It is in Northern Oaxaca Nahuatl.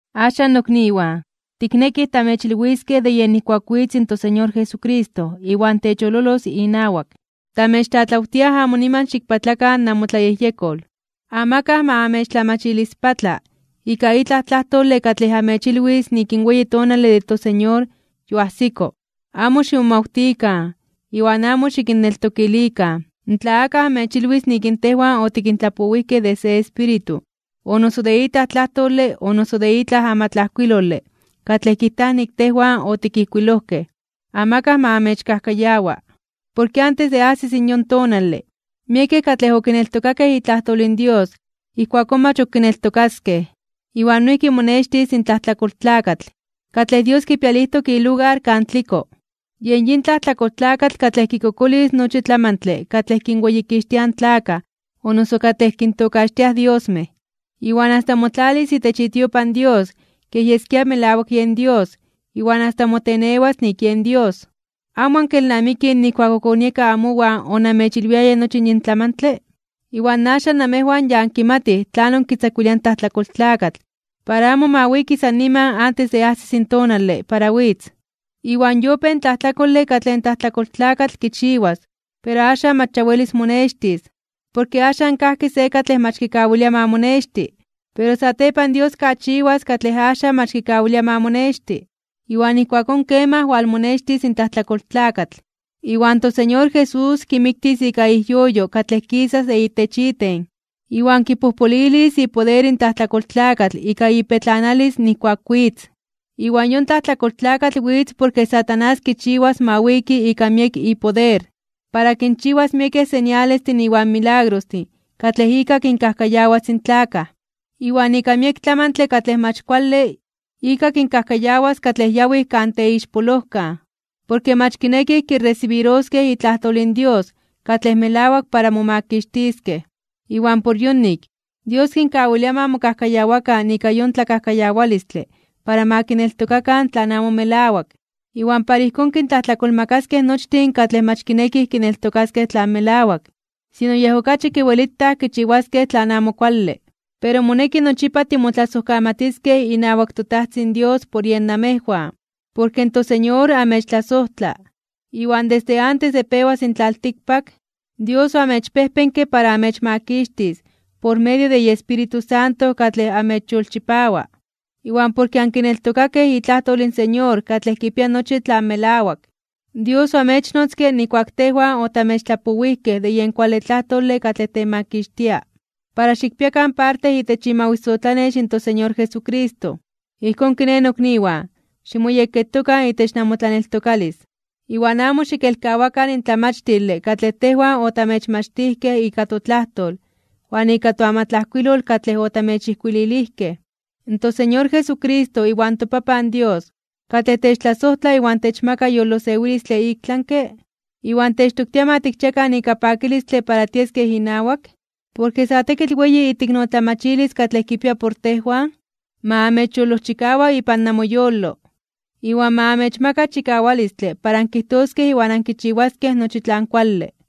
Axan, nokniwan, tiknekij tamechilwiskej de yen nijkuak witz in toSeñor Jesucristo iwan techololos inawak. Tamechtlatlawtiaj amo niman xikpatlakan namotlayejyekol. Amakaj ma amechtlamachilispatla ika itlaj tlajtole katlej amechilwis nik in weyi tonale de toSeñor yoajsiko. Amo ximomawtikan iwan amo xikinneltokilikan, tla akaj amechilwis nik tejwan otikintlapowijkej de se espíritu, o noso de itlaj tlajtole o noso de itlaj amatlajkuilole katlej kijtaj nik tejwan otikijkuilojkej. Amakaj ma amechkajkayawa. Porke antes de ajsis yon tonale, miekej katlej okineltokakej itlajtol in Dios ijkuakón mach ok kineltokaskej, iwan noijki monextis in tlajtlakoltlakatl, katlej Dios kipialijtok ilugar kan tliko. Yen yin tlajtlakoltlakatl katlej kikokolis nochi tlamantle katlej kinweyikixtiaj in tlakaj o noso katlej kintokaxtiaj diosmej. Iwan asta motlalis itech itiopan in Dios, kej yeskia melawak yen Dios, iwan asta motenewas nik yen Dios. ¿Amo ankelnamikij nijkuak ok onieka amowan onamechilwiaya nochi yin tlamantle? Iwan axan namejwan ya ankimatij tlanon kitzakuilia in tlajtlakoltlakatl, para amo ma wiki san niman antes de ajsis in tonale para witz. Iwan yopéj in tlajtlakole katlej in tlajtlakoltlakatl kichiwas, pero axan mach ya welis monextis, porke axan kajki se katlej mach kikawilia ma monexti. Pero satepan Dios kachiwas katlej axan mach kikawilia ma monexti. Iwan ijkuakón kemaj walmonextis in tlajtlakoltlakatl, iwan toSeñor Jesús kimiktis ika ijyoyo katlej kisas de itech iten, iwan kipojpolilis ipoder in tlajtlakoltlakatl ika ipetlanilis nijkuak witz. Iwan yon tlajtlakoltlakatl witz porke Satanás kichiwas ma wiki ika miek ipoder, para kinchiwas miekej señalestin iwan milagrostin katlej ika kinkajkayawas in tlakaj. Iwan ika miek tlamantle katlej mach kuale ika kinkajkayawas katlej yawij kan teixpolojkan, porke mach kinekij kiresibiroskej itlajtol in Dios katlej melawak para momakixtiskej. Iwan por yonik, Dios kinkawilia ma mokajkayawakan ika yon tlakajkayawalistle para ma kineltokakan tlan amo melawak, iwan para ijkón kintlajtlakolmakaskej nochtin katlej mach kinekij kineltokaskej tlan melawak, sino yej okachi kiwelitaj kichiwaskej tlan amo kuale. Pero moneki nochipa timotlasojkamatiskej inawak toTajtzin Dios por yen namejwan, porke in toSeñor amechtlasojtla. Iwan desde antes de pewas in tlaltikpak, Dios oamechpejpenke para amechmakixtis por medio de iEspíritu Santo katlej amechyolchipawa, iwan porke ankineltokakej itlajtol in Señor katlej kipia nochi tlan melawak. Dios oamechnotzke nijkuak tejwan otamechtlapowijkej de yen kuale tlajtole katlej temakixtia, para xikpiakan parte itech imawisotlanex in toSeñor Jesucristo. Ijkón kiné, nokniwan, ximoyekketokan itech namotlaneltokalis, iwan amo xikelkawakan in tlamachtile katlej tejwan otamechmachtijkej ika totlajtol iwan ika toamatlajkuilol katlej otamechijkuililijkej. ToSeñor Jesucristo iwan toPapan Dios, katlej techtlasojtla iwan techmaka yolosewilistle iktlanke (ik tlami), iwan techtoktia ma tikchiakan ika pakilistle para tieskej inawak, porke sa tekitl weyi iteiknotlamachilis katlej kipia por tejwan, ma amechyolojchikawa ipan namoyolo, iwan ma amechmaka chikawalistle para ankijtoskej iwan ankichiwaskej nochi tlan kuale.